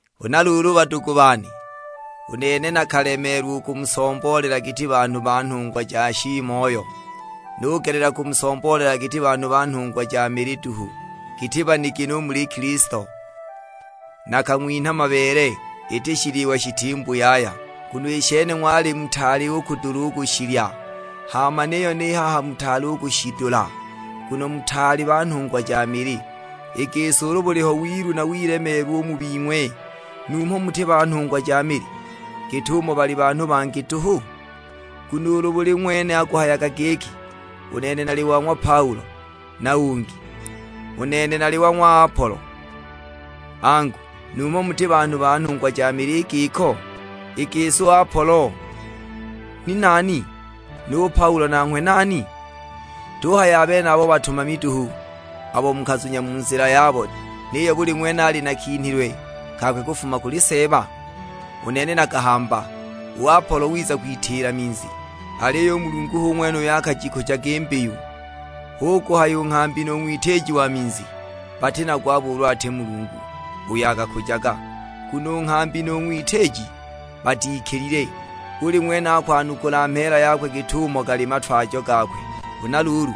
Huna luulu badugu bane, u nene nakalemeelwa u kumusomboolela giti banhu ba nhungwa ja shiimoyo, nugelela kumusomboolela giti banhu ba nhungwa ja mili duhu; giti banigini u muli Kilisto. Nakang'winha mabeele, iti shiliwa shitimbu yaya; nguno i shene ng'wali mutaali u kudula u kushilya, hama niyo ni haha mutaali u kushidula. Nguno mutaali ba nhungwa ja mili; i gisi ulu buliho wilu na wilemeelwa u mu bing'we, numho muti ba nhungwa ja mili, git'umo bali banhu bangi duhu? Nguno ulu buli ng'wene akuhayaga giki, "U nene nali wa ng'wa Paulo," na ungi, "U nene nali wa ng'wa Apolo;" angu, numho muti banhu ba nhungwa ja mili i giko? I gisi u Apolo ni nani, nu Paulo nanghwe nani? Tuhaya a benabo batumami duhu abo mukazunya mu nzila yabo, niyo buli ng'wene ali na kinhilwe kakwe kufuma kuli Seeba? U nene nakahamba, u Apolo wiza kwitiila minzi, aliyo u Mulungu hu ng'wene uyo akajikujaga i mbiyu. Hu kuhaya u nghambi nu ng'witiiji wa minzi, bati na gwabo ulu ati Mulungu, uyo akakujaga. Nguno u nghambi nu ng'witiiji batikilile; buli ng'wene akwanukula mheela yakwe git'umo gali a matwajo gakwe. Huna luulu,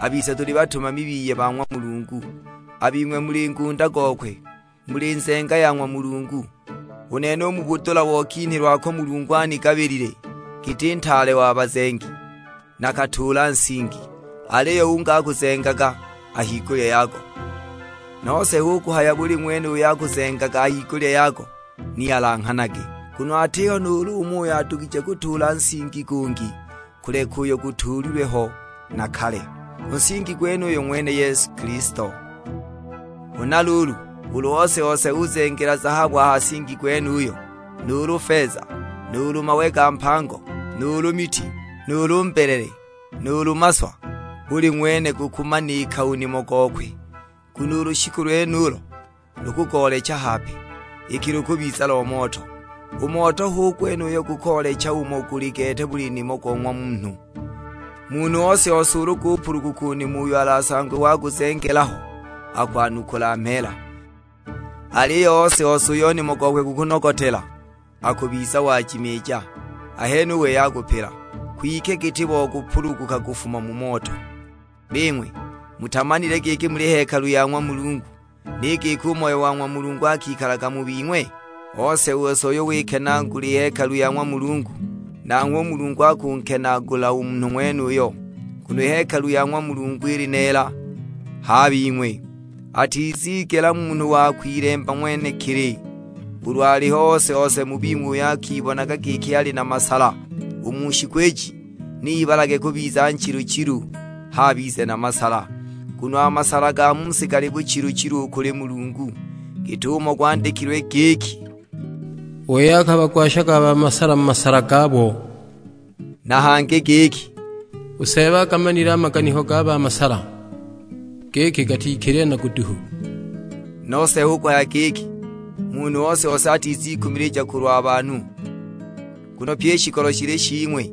a bise tuli batumami biye ba ng'wa Mulungu, a bing'we muli ngunda gokwe; muli nzenga ya ng'wa Mulungu. U nene u mu budula bo kinhilwe ako Mulungu anigabilile giti ntaale wa bazengi, nakatuula nsingi; aliyo ungi akuzengaga a higulya yago; nose hu kuhaya buli ng'wene uyo akuzengaga a higulya yago ni ilanghanage. Nguno atiho nuulu umo uyo adugije kutuula nsingi gungi, kuleka uyo gutuulilwe ho na kale; u nsingi gwenuyo ng'wene Yesu Kilisto. Huna luulu, ulu ose-ose uzengela zahabu a ha nsingi gwenuyo, nuulu feza, nuulu mawe ga mpango, nuulu miti, nuulu mbelele, nuulu maswa; buli ng'wene gukumanika u nimo gokwe. Nguno u lushiku lwenulo lukugoolecha hape, iki lukubiza lo moto. U moto hu gwene uyo gukoolecha umo guli gete buli nimo go ng'wa munhu. Munhu ose-ose ulu gupuluguka u nimo uyo alasangwe waguzengela ho, akwanukula mheela. Aliyo ose-ose uyo nimo gokwe gukunogotela akubiza wajimiija, ahene u wei akupila; kwike giti bo kupuluguka kufuma mu moto! Bing'we, mutamanile giki muli hekalu ya ng'wa Mulungu, ni giki u Moyo wa ng'wa Mulungu akikalaga mu bing'we? Ose-ose uyo wikenaagula i hekalu ya ng'wa Mulungu, nanghwe u Mulungu akunkenaagula u munhu ng'wenuyo, nguno i hekalu ya ng'wa Mulungu ili neela; h'a bing'we. Atizigela munhu wa kwilemba ng'wenekili; ulu aliho ose-ose mu bing'we uyo akibonaga giki ali na masala u mu shiku iji, ni ibalage kubiza nchilu-chilu, h'abize na masala. Nguno a masala ga mu si gali buchilu-chilu u kuli Mulungu; git'umo gwandikilwe giki, "U wei akabagwashaga a ba masala mu masala gabo;" na hangi giki, "U Seeba agamanile a maganiko ga ba masala, giki gatikilile na guduhu." Nose hu kuhaya giki, munhu ose-ose atizikumilija kulwa banhu, nguno pyi i shikolo shili shing'we;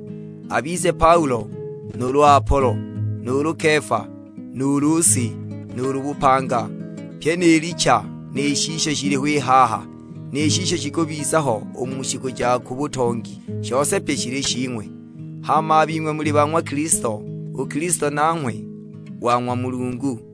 abize Paulo, nuulu Apolo, nuulu Kefa, nuulu si, nuulu bupanga. Pyi ni licha, ni shisho shiliho i haha, ni shisho shikubiza ho u mu shiku ja ku butongi; shose pye shili shing'we. Hama a bing'we muli ba ng'wa Kilisto, u Kilisto nanghwe wa ng'wa Mulungu.